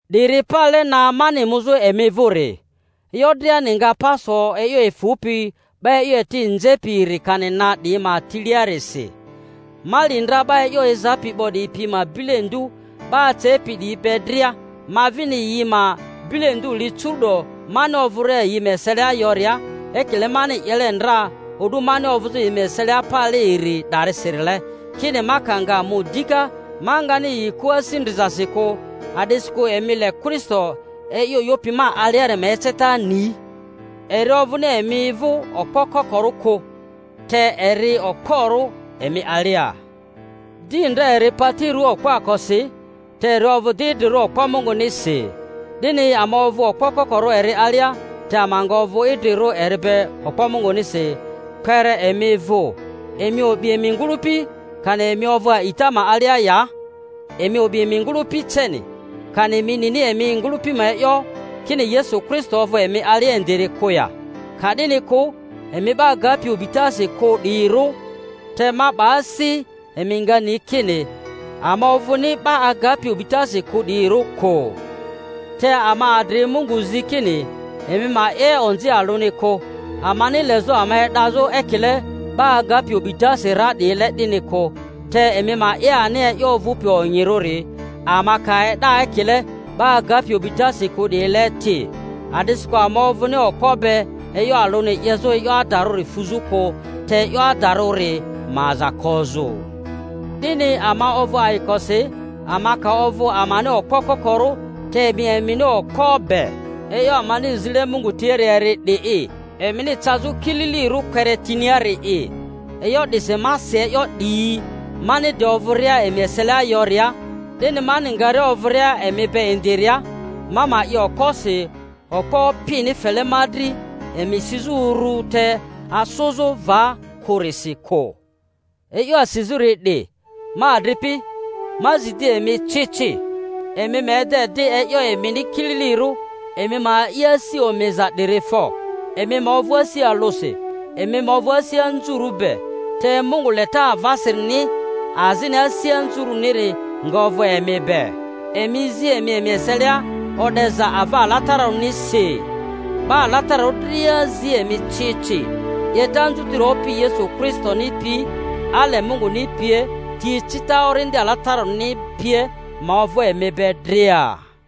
'Diri pale na mani muzᴜ emi vᴜri. E'yo driani nga pa so e'yo efᴜpi 'ba e'yo eti nzepi iri kani na 'diyi ma tiliarisi. Ma li ndra 'ba e'yo ezapi 'bo 'diyi pi ma bilendu 'ba acepi 'diyi be dria, ma vini yi ma bilendu li curu'do mani ovᴜria yi ma eselia yoria, ekile mani 'yele ndra o'du mani ovᴜzᴜ yi ma eselia pale iri 'dasirile, kini ma ka nga mu dika, ma ngani yi kᴜ asi ndrizasi kᴜ— a'disi-kᴜ emi le Kristo e'yo 'yopi ma aliari ma eceta ni. Eri ovᴜni emi vᴜ okpo kokoro kᴜ, te eri okporᴜ emi alia. Di ndra eri pati rᴜaa okpoakosi, te eri ovᴜ di idrirᴜ okpo Mungunisi. 'Dini ama ovᴜ okpo kokorᴜ eri alia, te ama nga ovᴜ idrirᴜ eri be okpo Mungunisi kpere emi vᴜ. Emi o'bi emi ngᴜlᴜpi, kani emi ovᴜ a'ita ma alia ya. Emi o'bi emi ngᴜlᴜpi ceni. Kani emi nini emi ngᴜlᴜpi ma e'yo, kini Yesu Kristo ovᴜ emi alia indiri kᴜ ya?—ka'dini kᴜ, emi 'ba agapi o'bitasi kᴜ 'diyirᴜ! Te ma 'ba asi, emi nga ni kini ama ovᴜni 'ba agapi o'bitasi kᴜ 'diyirᴜ kᴜ. Te ama adri Mungu zi kini emi ma 'ye onzi alᴜni kᴜ—amani lezᴜ ama e'dazᴜ ekile 'ba agapi o'bitasi ra 'diyile 'dini kᴜ, te emi ma 'ye ani e'yo ovᴜpi onyirᴜri, ama ka e'da ekile 'ba agapi o'bitasi kᴜ 'diyile ti. A'disikᴜ ama ovᴜni okpo be e'yo alᴜni 'yezᴜ e'yo adarᴜri fᴜzᴜ kᴜ, te e'yo adarᴜri ma aza kozᴜ. 'Dini ama ovᴜ ayikosi, ama ka ovᴜ amani okpo kokorᴜ, te emi emini okpo be. E'yo amani zile Mungu tiari eri 'di'i, emini cazᴜ kililirᴜ kpere tiniari'i E'yo 'disi ma si e'yo 'diyi, mani de ovᴜria emi eselia yoria, 'dini mani ngaria ovᴜria emi be indiria, ma ma 'ye okposi okpo Opini fele ma dri emi sizᴜ urᴜ te anzᴜzᴜ va kᴜrisi kᴜ. E'yo asizᴜri 'di, ma adripi, ma zi di emi ci ci. Emi ma ede di e'yo emini kililirᴜ, emi ma a'i asi omiza 'diri fo, emi ma ovᴜ asi alᴜsi, emi ma ovᴜ asi anzurᴜ be, te Mungu leta avasirini azini asi anzurᴜniri nga ovᴜ emi be. Emi zi emi emi eselia o'deza ava alatararᴜnisi. 'Ba alatararᴜ dria zi emi ci ci. 'Yeta anzutiri Opi Yesu Kristoni pi, ale Munguni pie, ti ecita Orindi Alatararᴜni pie, ma ovᴜ emi be dria.